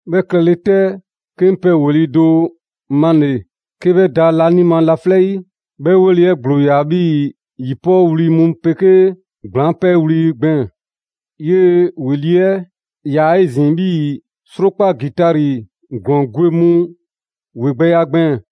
'Bhɛ klɛle 'tɛ, 'ke 'ŋ pɛ ‑weli' do male‑ 'ke 'bhɛ da laanima laflɛ' 'yi: 'Bhɛ ‑weli' 'ɛ ‑gblo ‑yaa 'bhii‑ ‑yi 'pɔɔ wli mu 'pegee ‑gblaŋ' 'pɛɛ wli gbɛɛn‑. 'Yee‑ ‑weli' 'ɛ 'yaa‑ 'ezin‑ 'bhii‑ 'srokpa ‑gitari ‑glɔɔn gwe mu 'wegbɛya gbɛɛn‑.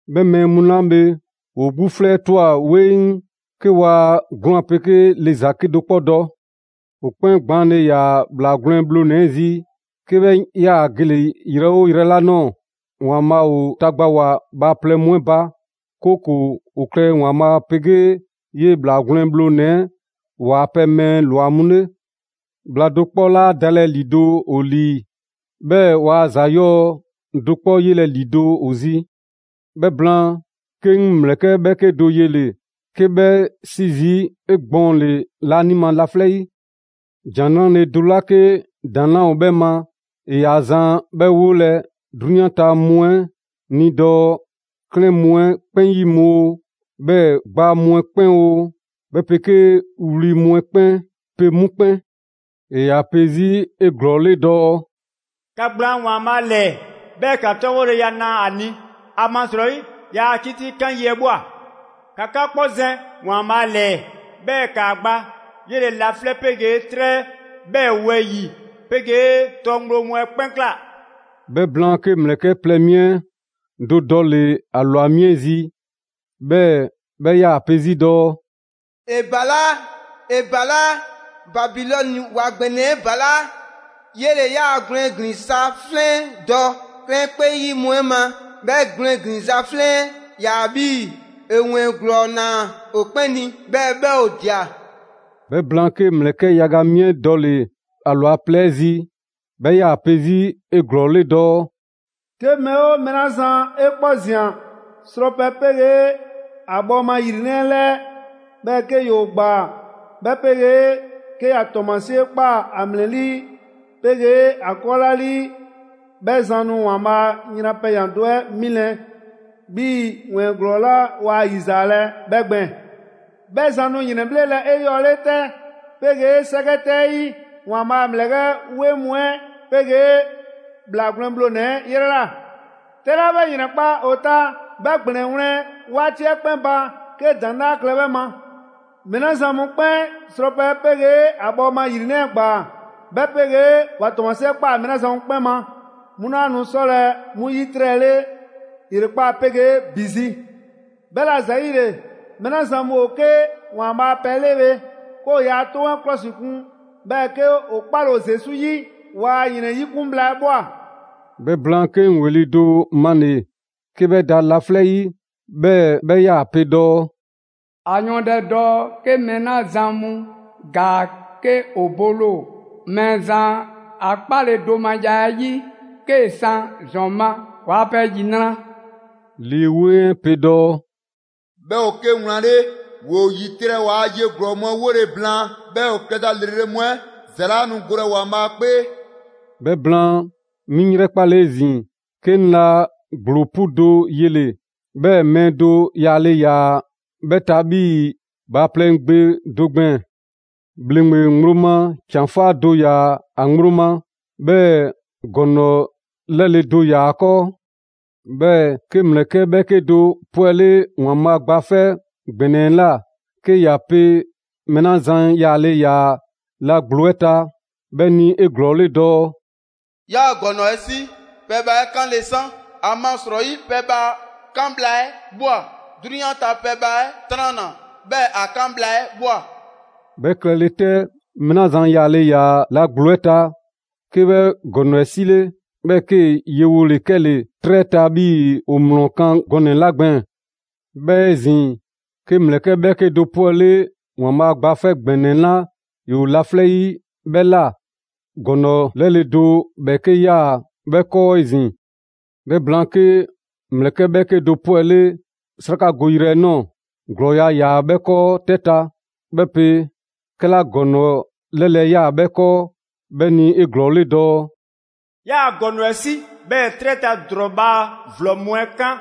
'Bhɛ mɛɛ mu 'la bhe, ‑woo 'gbu 'flɛ 'ɛ ꞊twa 'weŋ 'ke waa 'gwlaan 'pegee le ‑za 'kedo‑ 'kpɔ dɔ. ‑O 'kpɛn gbaanle ‑yaa ‑Bhlaa Gwlɛn Bhlonɛ‑ 'ɛ zi 'ke 'bhɛ 'yaa‑ gele‑ yrɛ 'oo yrɛ 'la ꞊nɔɔ. ‑Waanbhaa' ‑o tagbawoa bhaaplɛŋ mu 'ɛ ba, 'kooko‑ ‑o klɛ ‑Waanbhaa' 'pegee 'yee‑ ‑Bhlaa Gwlɛn Bhlonɛ‑ ‑waa' pɛ mɛɛ ‑lwa mu 'le. Bhla do 'kpɔ 'laa dalɛ ‑lido' ‑o ‑lii, 'bhɛɛ‑ waa ‑za 'yɔɔ do 'kpɔ 'yelɛ‑ ‑lido' ‑o zi. 'Bhɛ blaan, 'ke 'ŋ ‑mlɛkɛ' ‑bhɛɛke' do 'yele‑ 'ke 'bhɛ 'si zii' 'egbɔɔnle laanima laflɛ' 'yi; ‑Jan 'Nrale‑ do 'la 'ke ‑daŋ' 'laa ‑o 'bhɛ ma ‑e ‑yaa zan 'bhɛ 'wolɛ‑ 'drunyan ta mu 'ɛ ni dɔɔ: 'Klɛɛn mu 'ɛ 'kpɛn 'yi mu oo, 'bhɛɛ‑ ‑gbaa mu 'ɛ 'kpɛn oo, 'bhɛ 'pegee wli mu 'ɛ 'kpɛn 'pe mu 'kpɛn. ‑E ‑yaa pe 'zi 'eglɔɔle dɔɔ: «‑Ka ‑gblaan' ‑Waanbhaa' ‑lɛɛ, 'bhɛɛ‑ ‑ka 'tɔbhɔleya na ‑a ni! ‑Amasrɔyi ‑yaa 'kitikan yi 'ɛ ꞊bhwa. ‑Ka 'ka 'kpɔ zɛn ‑Waanbhaa' ‑lɛɛ, 'bhɛɛ‑ ‑kaa gba, 'yele‑ laflɛ' 'pegee 'trɛ, 'bhɛɛ‑ wɛyi‑ 'pegee tɔ ŋgblo mu 'ɛ 'kpɛn ꞊kla.» 'Bhɛ blaan, 'ke ‑mlɛkɛ' plɛ mi do dɔle‑ ‑a ‑lwa mi 'ɛ zi, 'bhɛɛ‑ 'bhɛ 'yaa‑ pe 'zi dɔɔ: «‑E ‑balaa', ‑e ‑balaa'! Babilɔni ‑wa ‑gbɛnɛ 'ɛ ‑balaa'! 'Yele‑ ‑yaa' 'gwlɛn ‑glinza' 'flɛn 'ɛ dɔ 'klɛɛn 'kpɛn 'yi mu 'ɛ ma. 'Bhɛ 'gwlɛn ‑glinza' 'flɛn 'ɛ 'yaa‑ 'bhii‑ ‑e ‑wɛɛn ‑glɔɔ ꞊naa ‑o 'kpɛn ni, 'bhɛɛ‑ 'bhɛ ‑o ꞊dia.» 'Bhɛ blaan, 'ke ‑mlɛkɛ' yaga mi 'ɛ dɔle‑ ‑a ‑lwa plɛ 'ɛ zi; 'bhɛ ‑yaa pe 'zi 'eglɔɔle dɔɔ: «'Ke mɛɛ 'oo mɛɛ 'la zan 'e kpɔ ꞊zian srɔpɛ 'pegee ‑a bhɔɔma ‑yrinɛ' 'ɛ 'lɛɛ, 'bhɛɛ‑ 'ke ‑yoo ‑gbaa, 'bhɛ 'pegee 'ke ‑ya ‑tɔɔmasie ꞊kpaa ‑a ‑mlɛlii' 'pegee ‑a 'kɔɔlaalii, 'Bhɛ zan nu ‑Waanbhaa' a yran pɛyan‑ do 'ɛ 'milɛ‑ 'bhii‑ ‑wɛɛn ‑glɔɔ 'la waa 'yizaalɛ 'bhɛ gbɛɛn‑. 'Bhɛ zan nu ‑yrɛnbhlelɛ 'eyɔɔle 'tɛ 'pegee 'sɛkɛ 'tɛ 'ɛ 'yi, ‑Waanbhaa' a ‑mlɛkɛ' 'weŋ mu 'ɛ 'pegee ‑Bhlaanɛ' Gwlɛn Bhlonɛ‑ 'yrɛ ꞊la. 'Tɛ 'la 'bhɛ ‑yrɛnkpa' ‑o ta, 'bhɛ ‑gblɛn 'ɛ wlɛn 'waati 'ɛ 'kpɛn ba 'ke ‑daŋ' 'laa klɛ 'bhɛ ma. Mɛɛ 'la zan mu 'kpɛn srɔpɛ 'ɛ 'pegee ‑a bhɔɔma ‑yrinɛ' 'ɛ ꞊gbaa, 'bhɛ 'pegee ‑wa ‑tɔɔmasie 'ɛ ꞊kpaa mɛɛ 'la zan mu 'kpɛn ma, 'mu 'laa nu 'sɔlɛ‑ 'mu 'yitrɛle ‑yrekpaa' 'pegee ‑bi zi.» 'Bhɛla‑ ‑zayile, mɛɛ 'la zan mu ‑o 'ke ‑Waanbhaa' a pɛ 'le bhe, 'ke ‑o yaa 'toŋ mu 'ɛ 'klɔsikun, 'bhɛɛ‑ 'ke ‑o 'kpale‑ ‑o Zesu 'yi, ‑waa' ‑yrɛn 'yikun bhla 'ɛ ꞊bhwa. 'Bhɛ blaan, 'ke 'ŋ ‑weli' do male‑ 'ke 'bhɛ da laflɛ' 'yi, 'bhɛɛ‑ 'bhɛ 'yaa‑ pe dɔɔ: «‑A yɔɔndɛ dɔɔ: ‹'Ke mɛɛ 'la zan mu ‑gaa 'ke ‑o bole ‑o Mɛɛzan a 'kpaledomaya 'ɛ 'yi, 'kee‑ san ‑zɔn ma, ‑waa pɛ ‑yinra'!›» Lii 'Weŋ 'ɛ pe dɔɔ: «'Bhɛ ‑o 'ke wlan 'le. ‑Woo ‑yitrɛ' ‑waa' ye ‑glɔɔ mu 'ɛ 'wole‑ blaan, 'bhɛɛ‑ ‑o klɛza ‑lrele' mu 'ɛ ‑za 'laa nu golɛ ‑Waanbhaa' 'kpee.» 'Bhɛ blaan, 'mi 'ŋ 'yrɛkpale 'ezin‑, 'ke 'ŋ la ‑gblo 'pu do yele‑, 'bhɛɛ‑ mɛɛ do yaale ‑yaa 'bhɛ ta 'bhii‑ bhaaplɛŋ gbe do gbɛɛn‑. ‑Bhleŋgbe ŋgblo ma ‑can 'faa do ‑yaa ‑a ŋgblo ma, 'bhɛɛ‑ ‑gɔŋlɔ ‑lɛle' do ‑yaa ‑a 'kɔɔ. 'Bhɛɛ‑ 'ke ‑mlɛkɛ' 'bhɛɛke do 'pwɛle ‑Waanbhaa' Gba 'Fɛ ‑Gbɛnɛ 'ɛ ꞊la 'ke ‑ya pe mɛɛ 'la zan yaale ‑yaa la ‑gblo 'ɛ ta 'bhɛ ni 'eglɔɔle dɔɔ: «'Yaa‑ ‑gɔŋlɔ 'ɛ 'si, pɛbhaa 'ɛ 'kanle san, ‑amasrɔyi pɛbhaa 'kan bhla 'ɛ ꞊bhwa; 'drunyan ta pɛbhaa 'ɛ 'tranna‑, 'bhɛɛ‑ ‑a 'kan bhla 'ɛ ꞊bhwa!» 'Bhɛ klɛle 'tɛ, mɛɛ 'la zan yaale ‑yaa la ‑gblo 'ɛ ta, 'ke 'bhɛ ‑gɔŋlɔ 'ɛ 'sile, 'bhɛɛ‑ 'kee‑ yewole 'kɛle‑ 'trɛ 'ɛ ta 'bhii‑ ‑o ‑mlɔ kan gɔnɛ‑ 'la gbɛɛn‑. 'Bhɛɛ‑ 'ezin‑, 'ke ‑mlɛkɛ' 'bhɛɛke do 'pwɛle ‑Waanbhaa' Gba 'Fɛ ‑Gbɛnɛ 'la ‑yoo laflɛ' 'yi 'bhɛ ꞊la; ‑gɔŋlɔ ‑lɛle' do ‑bhɛɛke' 'yaa‑ 'bhɛ 'kɔɔ 'ezin‑. 'Bhɛ blaan, 'ke ‑mlɛkɛ' 'bhɛɛke do 'pwɛle 'srakagoyrɛ 'ɛ ꞊nɔɔ, ‑glɔɔya' 'yaa‑ 'bhɛ 'kɔɔ 'tɛ ta. 'Bhɛ pe 'kɛla ‑gɔŋlɔ‑ 'lɛle‑ 'ɛ 'yaa‑ 'bhɛ 'kɔɔ 'bhɛ ni 'eglɔɔle dɔɔ: «'Yaa‑ ‑gɔŋlɔ 'ɛ 'si, 'bhɛɛ‑ 'trɛ ta ‑drɔɔ bhaa ‑vlɔ mu 'ɛ 'kan,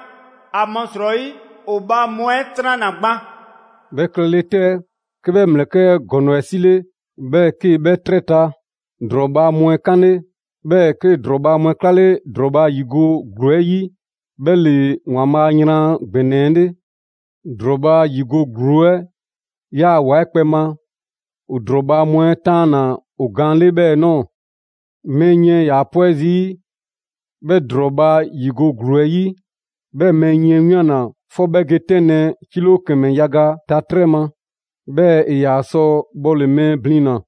‑amasrɔyi ‑o bhaa mu 'ɛ 'tranna‑ gban.» 'Bhɛ klɛle 'tɛ, 'ke 'bhɛ ‑mlɛkɛ' 'ɛ ‑gɔŋlɔ 'ɛ 'sile; 'bhɛɛ‑ 'ke 'bhɛ 'trɛ ta ‑drɔɔ bhaa mu 'ɛ 'kanle. 'Bhɛɛ‑ 'kee‑ ‑drɔɔ bhaa mu 'ɛ 'klale ‑drɔɔ bhaa ‑yigo' ‑gluu 'ɛ 'yi. 'Bhɛ ‑le ‑Waanbhaa' a yran ‑gbɛnɛ 'ɛ 'le. ‑Drɔɔ bhaa ‑yigo' ‑gluu 'ɛ 'yaa‑ ‑wa 'ɛ kpɛ ma. ‑O ‑drɔɔ bhaa mu 'ɛ 'taanna‑ ‑o gaan 'le 'bhɛɛ‑ ꞊nɔɔ; mɛɛ yiɛn ‑yaa 'pwɛ zii' 'bhɛ ‑drɔɔ bhaa ‑yigo' ‑gluu 'ɛ 'yi. 'Bhɛ mɛɛ yiɛn 'ɛ 'wianna‑ 'fɔ 'bhɛ ge 'tɛnlɛ‑ 'kilo ‑kɛmɛ yaga ta 'trɛ ma; 'bhɛɛ‑ ‑e ‑yaa sɔ bhɔle‑ mɛɛ ‑blina.